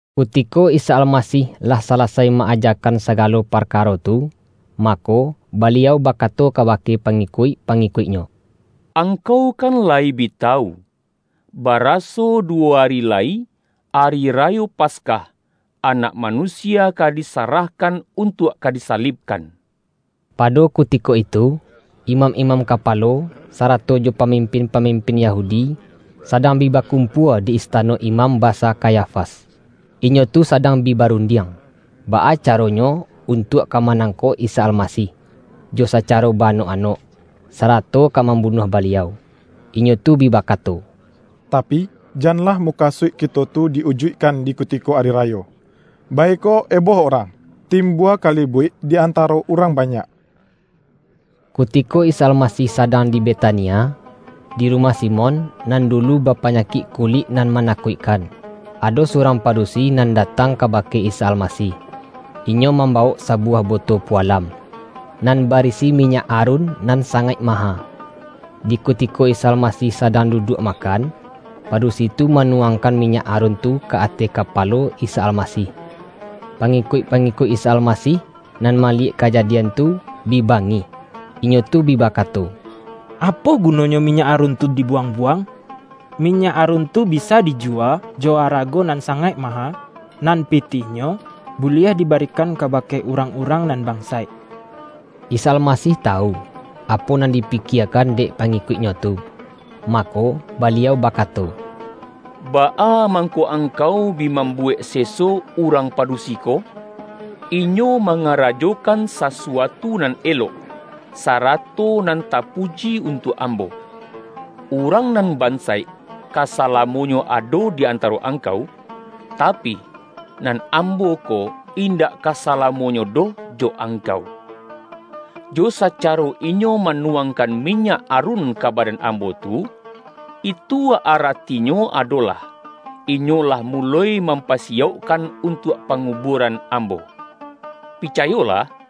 Kutiko Isa Almasih lah sala-sai ma-ajakan sagalo parkaro tu, mako, Baliau bakato kabake pangi-kuik-pangikuik-Nyo, ”Angkau kan layi bi tawu, baraso duwo ari lai Ari Rayo Paskah, Anak Manusia ka disa-rahkan untuak ka disalibkan!” Pado kutiko itu, imam-imam ka-palo, sarato jo pamimpin-pamimpin Yahudi sadang bi bakumpua di istano Imam Basa Kayafas. Inyo tu sadang bi barundiang, baa caronyo untuak ka manangkok Isa Almasih, jo sacaro ba-anok-anok, sarato ka mambunuah Baliau. Inyo tu bi bakato,”Tapi, janlah mukasuik kito tu di-ujuikkan di ku-tiko Ari Rayo, baiko eboh urang, timbua kalibuik di antaro urang banyak.” Kutiko Isa Almasih sadang di Be-tania, di rumah Simon nan dulu ba-panyakik kulik nan manakuikkan, ado surang padusi nan datang ka-bake Isa Almasih. Inyo mambawok sa-buwah boto pualam, nan barisi minyak arun nan sangaik maha. Di kutiko Isa Almasih sadang duduak makan, padu-si tu manuwangkan minyak arun tu ka ateh kapalo Isa Almasih. Pangi-kuik-pangikuik Isa Almasih nan mali-yek kajadian tu, bi bangih. Inyo tu bi bakato,”Apo gunonyo minyak arun tu dibuwang-buwang?” ”Minyak arun tu bisa dijuwa jo arago nan sangaik ma-ha, nan pitihnyo buliah dibarikan ka-bake urang-urang nan bansaik!” Isa Almasih tawu, apo nan dipikie-kan dek pangikuik-Nyo tu, mako, Baliau bakato,”Baa mangko angkau bi mambu-wek seso urang padusi ko? Inyo manga-rajokan sasuatu nan elok, sarato nan ta-puji untuak Ambo. Urang nan bansaik, ka salamonyo ado di antaro angkau, ta-pi, nan Ambo ko indak kasalamonyo doh jo angkau. Jo sacaro inyo manuwang-kan minyak arun ka badan Ambo tu, itu aratinyo adolah, inyo lah muloi mampa-siyaukkan untuak pangubuaran Ambo. Picayolah!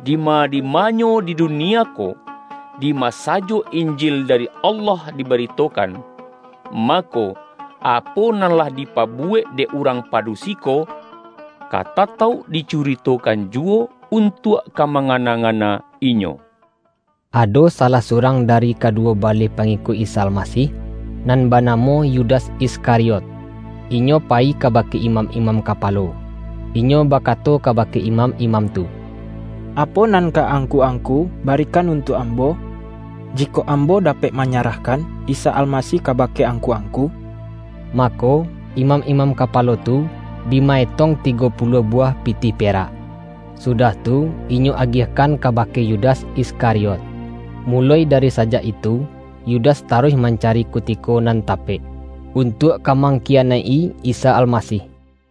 Dima-dimanyo di dunia ko, dima sajo Injil dari Allah dibaritokan, mako, apo nan lah dipabuwek dek urang padusi ko ka tatauk dicuritokan juwo, untuak ka mangana-ngana inyo.” Ado salah surang dari kaduwo ba-leh pangikuik Isa Almasih, nan bana-mo Yudas Iskariot, inyo payi kabake imam-imam kapalo. Inyo bakato kabake imam-imam tu,”Apo nan ka angku-angku barikan untuak ambo, ji-kok ambo dapek manyarahkan Isa Al-masih kabake angku-angku?” Mako, imam-imam kapalo tu, bi ma-etong ti-go puluah buwah pitih perak, sudah tu inyo agiahkan kabake Yudas Iskariot. Muloi dari sajak itu, Yudas taruih mancari kutiko nan tapek, untuak ka mangkiyanaik-i Isa Almasih.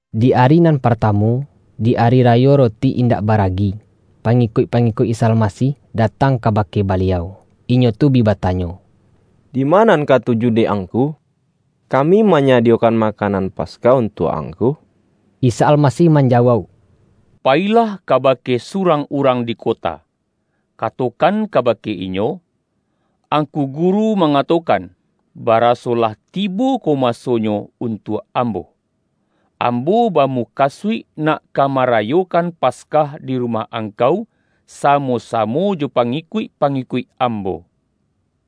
Di ari nan partamu, di Ari Rayo Roti Indak Baragi, pangikuik-pangi-kuik Isa Almasih datang kabake Baliau. Inyo tu bi batanyo,”Dima nan katuju dek Angku, kami manyadiyokan ma-kanan Paskah untuak Angku?” Isa Almasih manjawauk,”Payi-lah kabake surang urang di kota, ka-tokan kabake inyo, ’Angku Guru ma-ngatokan, baraso lah tibo ko masonyo untuak Ambo; Ambo bamukasuik nak ka marayokan Paskah di rumah ang-kau samo-samo jo pangikuik-pangi-kuik Ambo.’”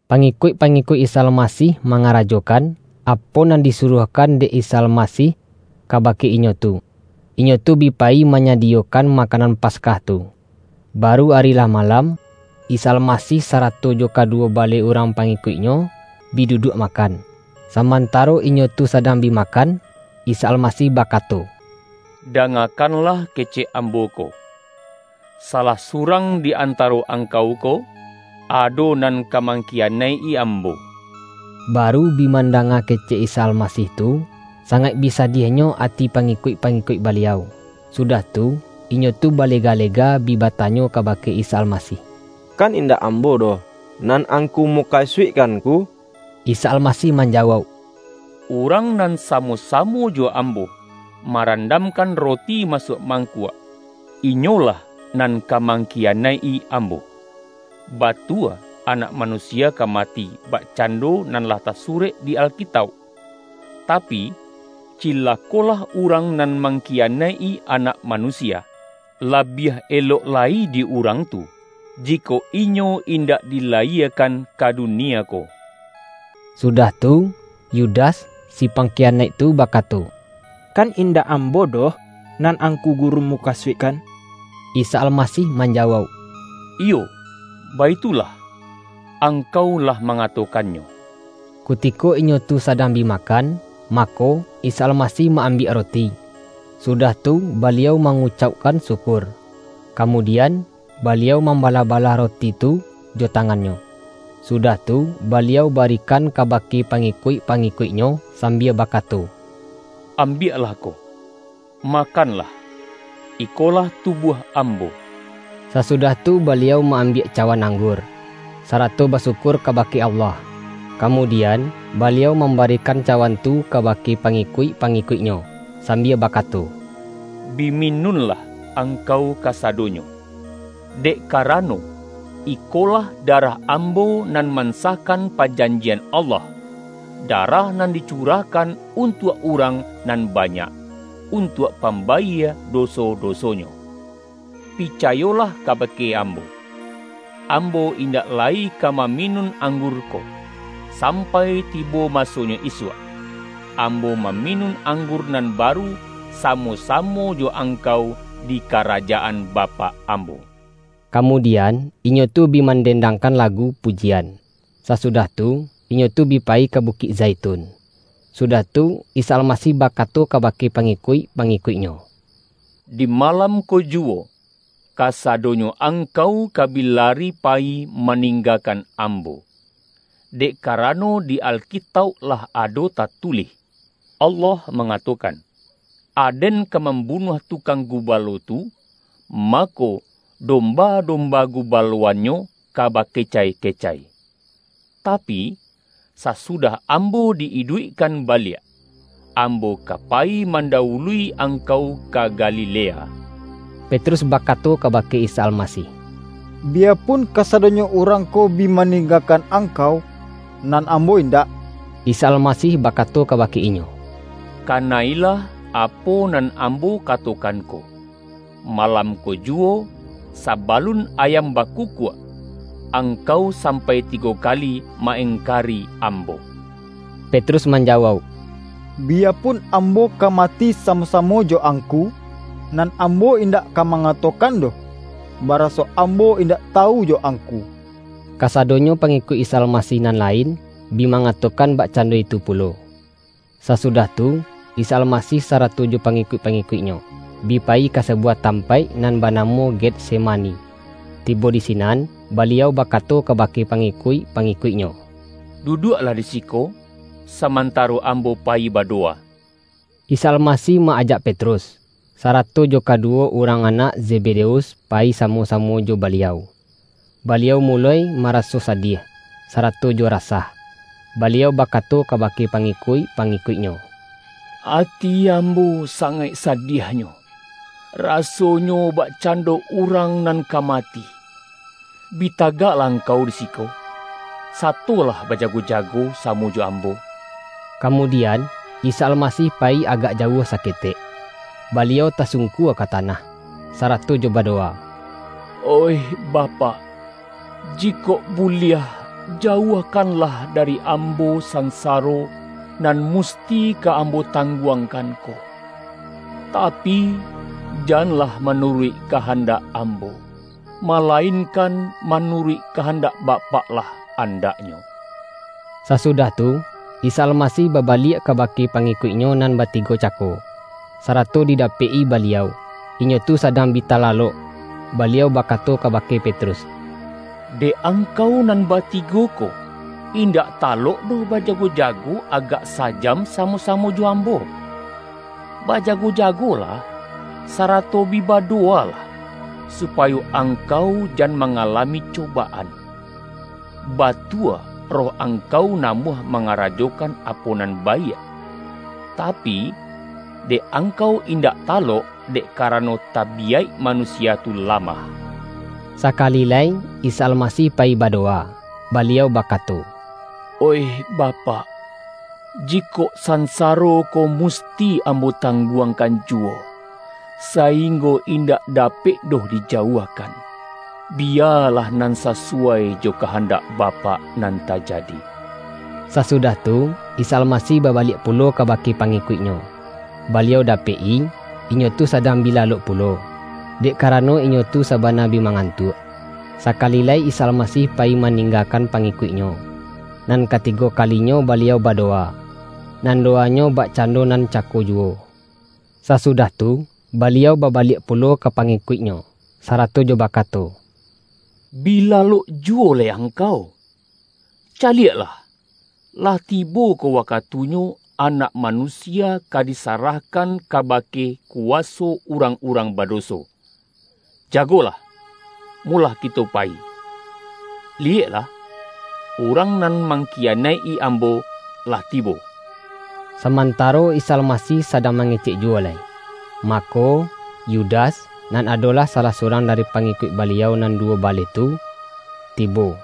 Pangikuik-pangikuik Isa Almasih mangarajokan, apo nan disuruahkan dek Isa Almasih kabake inyo tu. Inyo tu bi payi manyadiyokan makanan Paskah tu. Baru ari lah malam, Isa Alma-sih sarato jo kaduwo baleh urang pangikuik-Nyo, bi duduak makan. Samantaro inyo tu sadang bi ma-kan, Isa Almasih bakato,”Dangakan-lah kecek Ambo ko: salah surang di antaro angkau ko, ado nan ka mang-kiyanaik-i Ambo.” Baru bi mandanga kecek Isa Alma-sih tu, sangaik bi sadiahnyo ati pangi-kuik-pangikuik Baliau. Sudah tu, inyo tu balega-lega bi batanyo kabake Isa Almasih,”Kan indak ambo doh, nan Angku mukasuikkan Ngku?” Isa Almasih manjawauk,”Urang nan samo-samo jo Ambo marandam-kan roti masuak mangkuak, inyo lah nan ka mangkiyanaik-i Ambo. Batua Anak Manusia ka mati bakcando nan lah tasurek di Alkitauk. Tapi, cilako-lah urang nan mangkiyanaik-i Anak Manusia! Labiah elok lai di urang tu jikok inyo indak dilayiekan ka dunie ko!” Sudah tu, Yudas, si pangkiyanaik tu bakato,”Kan indak ambo doh nan Angku Guru mukasuikkan?” Isa Almasih manjawauk,”Iyo baitu-lah, angkau lah mangatokannyo!” Kutiko inyo tu sadang bi makan, mako, Isa Almasih ma-ambiak roti, su-dah tu Baliau mangucaukkan syukur. Kamudian, Baliau mambalah-balah ro-ti tu jo tangan-Nyo, sudah tu, Baliau barikan kabake pangikuik-pangikuik-Nyo sambia bakato,”Ambiaklah ko, makanlah; ikolah tubuah Ambo.” Sasudah tu Baliau ma-ambiak cawan anggur, sarato basyukur ka-bake Allah. Kamudian, Baliau mam-barikan cawan tu kabake pangikuik-pangikuik-Nyo, sambia bakato,”Bi minunlah, angkau kasadonyo. Dek karano, ikolah darah Ambo nan man-sahkan pajanjian Allah -- darah nan dicurahkan untuak urang nan ba-nyak, untuak pambayie doso-doso-nyo. Picayolah kabake Ambo: Am-bo indak lai ka maminun anggur ko, sampai tibo masonyo isuak, Ambo maminun anggur nan baru samo-samo jo angkau di Karajaan Bapak Ambo.” Kamudian, inyo tu bi manden-dangkan lagu pujian. Sasudah tu, inyo tu bi payi ka Bukik Zaitun. Sudah tu, Isa Almasih bakato ka-bake pangikuik-pangikuik-Nyo,”Di malam ko juwo kasadonyo angkau ka bi lari payi maninggakan Ambo; dek karano di Alkitauk lah ado tatulih: Allah mangatokan, ’Aden ka mambu-nuah tukang gubalo tu, mako, domba-domba gubaloannyo ka bakecai-kecai.’ Tapi, sasudah Ambo di-iduikkan ba-liak, Ambo ka payi mandawului ang-kau ka Galilea.” Petrus bakato kabake Isa Alma-sih,”Biyapun kasadonyo urang ko bi maninggakan Angkau, nan ambo in-dak!” Isa Almasih bakato kabake inyo,”Kana-ilah apo nan Ambo katokan ko, malam ko juwo, sabalun ayam baku-kuak, angkau sampai tigo kali ma-engkari Ambo.” Petrus manjawauk,”Biyapun am-bo ka mati samo-samo jo Angku, nan ambo indak ka mangatokan doh, ba-raso ambo indak tawu jo Angku!” Kasadonyo pangikuik Isa Almasih nan lain, bi mangatokan bakcando itu pulo. Sasudah tu, Isa Almasih sarato jo pangikuik-pangikuik-Nyo, bi payi ka sa-buwah tampaik nan banamo Getsema-ni. Tibo di sinan, Baliau bakato kabake pangikuik-pangikuik-Nyo,”Duduaklah di siko samantaro Ambo payi badowa.” Isa Almasih ma-ajak Petrus, sarato jo kaduwo urang anak Zebedeus payi sa-mo-samo jo Baliau. Baliau muloi mara-so sadiah, sarato jo rasah. Baliau ba-kato kabake pangikuik-pangikuik-Nyo,”Ati Ambo sangaik sadiahnyo, rasonyo bakcando urang nan ka mati. Bi tagaklah angkau di siko, satolah bajago-jago samo joAmbo.” Kamudian, Isa Almasih payi agak jauah saketek, Baliau tasungkua ka ta-nah, sarato jo badowa,”Oih Bapak, jikok buliah, jauahkanlah dari Ambo sansaro, nan musti ka Ambo tang-guangkan ko. Tapi, janlah manuruik kahandak Ambo, malainkan manuruik kahandak Bapak lah andaknyo.” Sasudah tu, Isa Almasih babaliak kabake pangikuik-Nyo nan batigo cako, sarato didapek-i Baliau, inyo tu sadang bi talalok. Baliau bakato kabake Petrus,”Dek angkau nan batigo ko, indak talok doh bajago-jago agak sa-jam samo-sa-mo joAmbo? Bajago-jagolah, sarato bi badowalah, supayo angkau jan ma-ngalami cobaan. Batua roh angkau na-muah mangarajokan apo nan baiak, ta-pi, dek angkau indak talok, dek karano, tabiyaik manusia tu lamah” Sakali lai Isa Almasih payi badowa, Baliau bakato,”Oih Bapak, jikok sansaro ko musti Ambo tangguangkan juwo, sa-inggo indak dapek doh dijauahkan, biya-lah nan sasuwai jo kahandak Bapak nan tajadi.” Sasudah tu, Isa Almasih baba-liak pulo kabake pangikuik-Nyo, Baliau dapek-i, inyo tu sadang bi lalok pulo, dek karano inyo tu sabana bi mangantuak Sakali lai Isa Almasih payi maning-gakan pangikuik-Nyo, nan katigo kali-nyo Baliau badowa, nan dowa-Nyo bak-cando nan cako juwo. Sasudah tu, Baliau babaliak pulo ka pangikuik-Nyo, sarato jo bakato,”Bi lalok juwo lai ang-kau? Caliaklah, lah tibo ko wakatunyo Anak Manusia ka disarahkan kabake kuwaso urang-urang badoso. Jagolah, molah kito payi. Liyeklah! Urang nan mangkiyanaik-i Ambo lah tibo!” Samantaro Isa Almasih sadang ma-ngecek juwo lai, mako, Yudas, nan adolah salah surang dari pangikuik Baliau nan duwo baleh tu, tibo.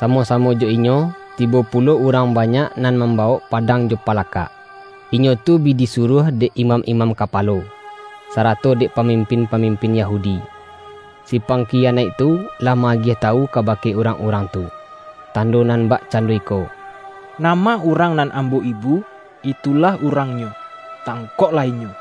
Samo-samo jo inyo, tibo pulo urang banyak nan mam-bawok padang jo palakak. Inyo tu bi disuruah dek imam-imam kapalo, sa-rato dek pamimpin-pamimpin Yahudi. Si pangkiyanaik tu lah ma-agiah tawu kabake urang-urang tu, tando nan bak-cando iko,”Nama urang nan ambo ibu, itulah Urangnyo. Tangkoklah Inyo!”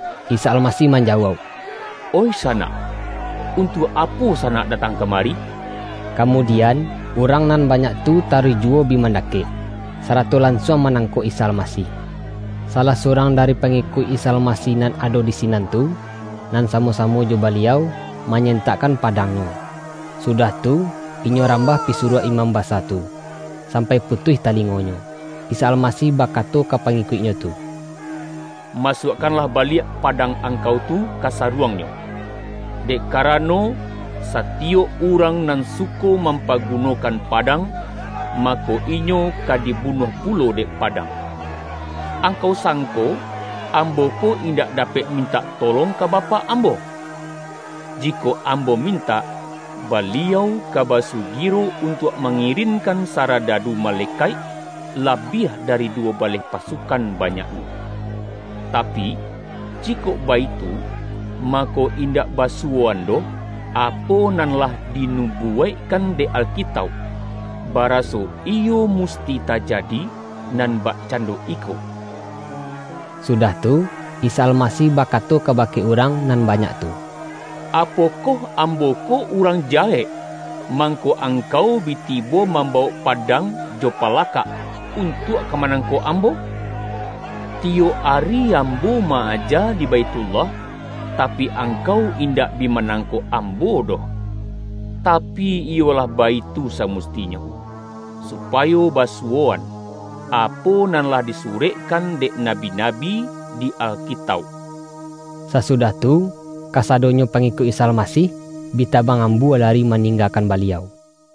Isa Almasih manjawauk,”Oih sa-nak, untuak apo sanak datang kama-ri?” Kamudian, urang nan banyak tu taruih juwo bi mandakek, sarato lan-suang manangkok Isa Almasih. Salah surang dari pangikuik Isa Almasih nan ado di sinan tu, nan samo-samo jo Ba-liau, manyentakkan padangnyo, sudah tu, inyo rambah pisuruah imam basa tu, sampai putuih talingonyo. Isa Almasih bakato ka pangikuik-Nyo tu,”Masuakkanlah baliak padang ang-kau tu ka saruangnyo, dek karano, satiyok urang nan suko mampaguno-kan padang, mako, inyo ka dibunuah pulo dek padang. Angkau sangko, Ambo ko indak dapek mintak tolong ka Bapak Ambo? Jikok Ambo mintak, Baliau ka basugiro untuak mangirin-kan saradadu malekaik, labiah dari duwo baleh pasukan banyaknyo. Tapi, jikok baitu, mako indak basu-woan doh, apo nan lah dinubuwaik-kan dek Alkitauk, baraso iyo musti ta-jadi nan bakcando iko?” Sudah tu, Isa Almasih bakato ka-bake urang nan banyak tu,”Apokoh Ambo ko urang jahek, mangko angkau bi tibo mambawok padang jo palakak, untuak ka manangkok Ambo? Tiyok ari Ambo ma-aja di Baithullah, tapi, ang-kau indak bi manangkok Ambo doh! Tapi, iyo lah baitu samustinyo, supayo basuwoan, apo nan lah disurek-kan dek nabi-nabi di Alkitauk.” Sasudah tu, kasadonyo pangikuik Isa Almasih, bi tabang ambua lari ma-ninggakan Baliau.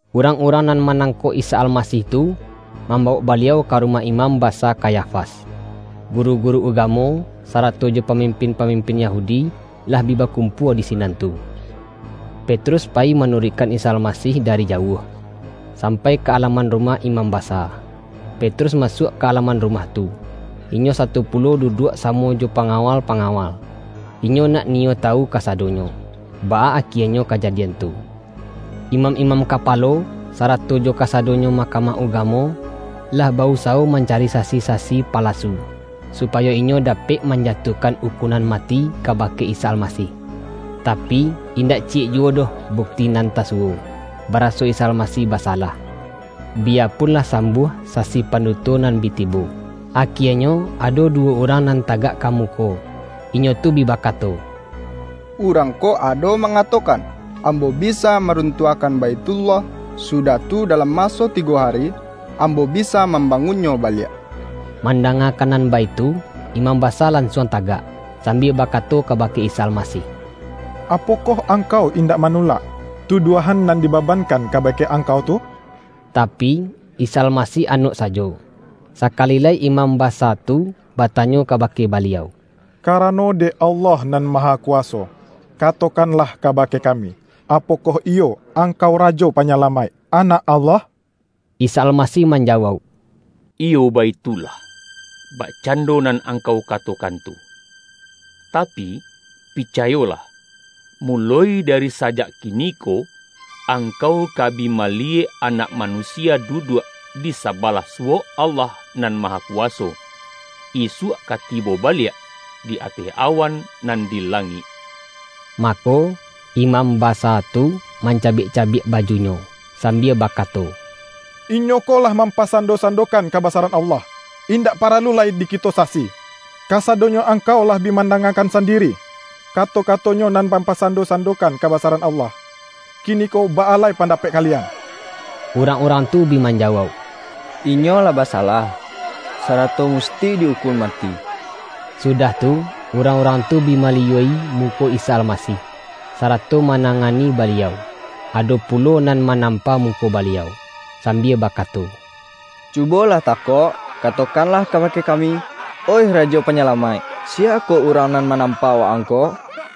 Urang-urang nan manangkok Isa Almasih tu, mambawok Baliau ka ru-mah Imam Basa Kayafas. Guru-guru ugamo, sarato jo pamimpin-pamim-pin Yahudi, lah bi bakumpua di sinan tu. Petrus payi manuruikkan Isa Almasih dari jauah, sampai ka alaman rumah imam basa. Petrus masuak ka alaman rumah tu, inyo sato pulo du-duak samo jo pangawal-pangawal. Inyo nak niyo tawu kasadonyo, baa akienyo kajadian tu. Imam-imam kapalo, sa-rato jo kasadonyo Mahkamah Ugamo, lah ba-usawo mancari sasi-sasi pala-su, supayo inyo dapek manjatuahkan ukunan mati kabake Isa Almasih. Ta-pi, indak ciyek juwo doh bukti nan ta-suwo, baraso Isa Almasih basalah, bi-yapun lah sambuah sasi panduto nan bi tibo. Akienyo, ado duwo urang nan tagak ka muko. Inyo tu bi bakato,”Urang ko ado mangatokan, ’Ambo bi-sa maruntuahkan Baithullah, sudah tu dalam maso tigo ari, Ambo bisa mam-bangunnyo baliak.’” Mandangakan nan baitu, imam basa lansuang tagak, sambia bakato kabake Isa Almasih,”Apokoh Angkau indak manulak, tuduahan nan dibaban-kan kabake Angkau tu?” Tapi, Isa Almasih anok sajo. Sakali lai imam ba-sa tu batanyo kabake Baliau,”Karano dek Allah nan Mahakuwaso, katokan-lah kabake kami, apokoh iyo Angkau Rajo Panyalamaik, Anak Allah?” Isa Almasih manjawauk,”Iyo baitulah, bakcando nan angkau ka-tokan tu. Tapi, picayolah: muloi dari sajak kiniko, angkau ka bi maliyek Anak Manusia duduak, di sabalah su-wok Allah Nan Mahakuwaso, isuak ka tibo baliak, di ateh awan nan di langik!” Mako, imam basa tu mancabiak-cabiak bajunyo, sambia bakato,”Inyo ko lah mampasando-sandokan kabasa-ran Allah! Indak paralu lai di kito sasi. Kasadonyo angkau lah bi mandanga-kan sandiri, kato-kato-Nyo nan mam-pasando-sandokan kabasaran Allah. Kiniko baa lai pandapek kalian?” Urang-urang tu bi manjawauk,”Inyo lah basalah, sarato musti di ukun ma-ti.” Sudah tu, urang-urang tu bi mali-yua-i muko Isa Almasih, sarato mana-ngani Baliau. Ado pulo nan manampa muko Baliau, sambia bakato,”Cu-bolah takok, katokanlah kabake kami, oih Rajo Panyalamaik! Siya ko urang nan manampa Wa-ang ko?”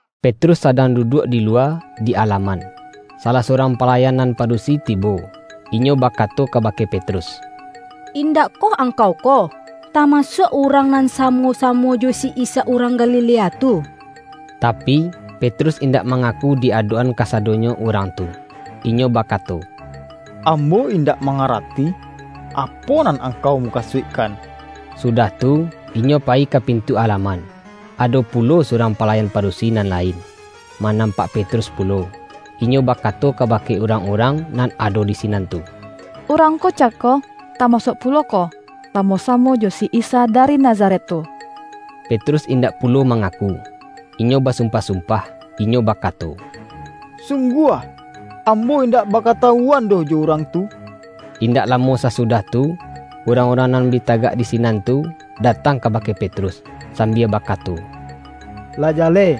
Petrus sadang duduak di luwa, di alaman. Salah surang palayan nan padusi tibo, inyo bakato kabake Petrus,”Indak koh angkau ko tama-suak urang nan samo-samo jo si Isa urang Galilea tu?” Tapi, Petrus indak mangaku di adok-an kasadonyo urang tu. Inyo ba-kato,”Ambo indak mangarati, apo nan angkau mukasuikkan,” sudah tu, inyo payi ka pintu alaman. Ado pulo surang palayan padusi nan lain, ma-nampak Petrus pulo, inyo bakato ka-bake urang-urang nan ado di sinan tu,”Urang ko cako, tamasuak pulo ko, sa-mo-samo jo si Isa dari Nazaret tu.” Petrus indak pulo mangaku, inyo basumpah-sumpah. Inyo baka-to,”Sungguah, ambo indak bakatawu-an doh jo Urang tu!” Indak lamo sasudah tu, urang-urang nan bi tagak di sinan tu, datang kabake Petrus, sambia bakato,”Lah ja-leh,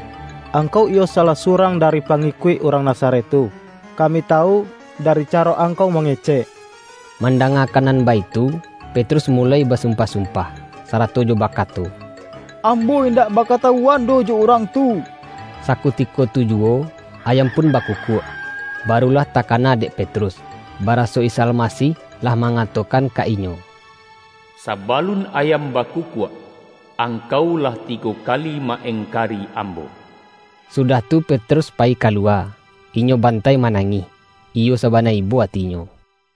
angkau iyo salah surang dari pa-ngikuik Urang Nazaret tu. Kami tawu, dari caro angkau mangecek.” Mandangakan nan baitu, Petrus muloi basumpah-sumpah, sarato jo ba-kato,”Ambo indak bakatawuan doh jo Urang tu!” Sakutiko tu juwo, ayam pun baku-kuak. Barulah takana dek Petrus, baraso Isa Almasih lah mangatokan ka inyo,”Sabalun ayam bakukuak, angkau lah tigo kali ma-engkari Ambo.” Sudah tu Petrus payi kaluwa, inyo bantai ma-nangih, iyo sabana ibo atinyo.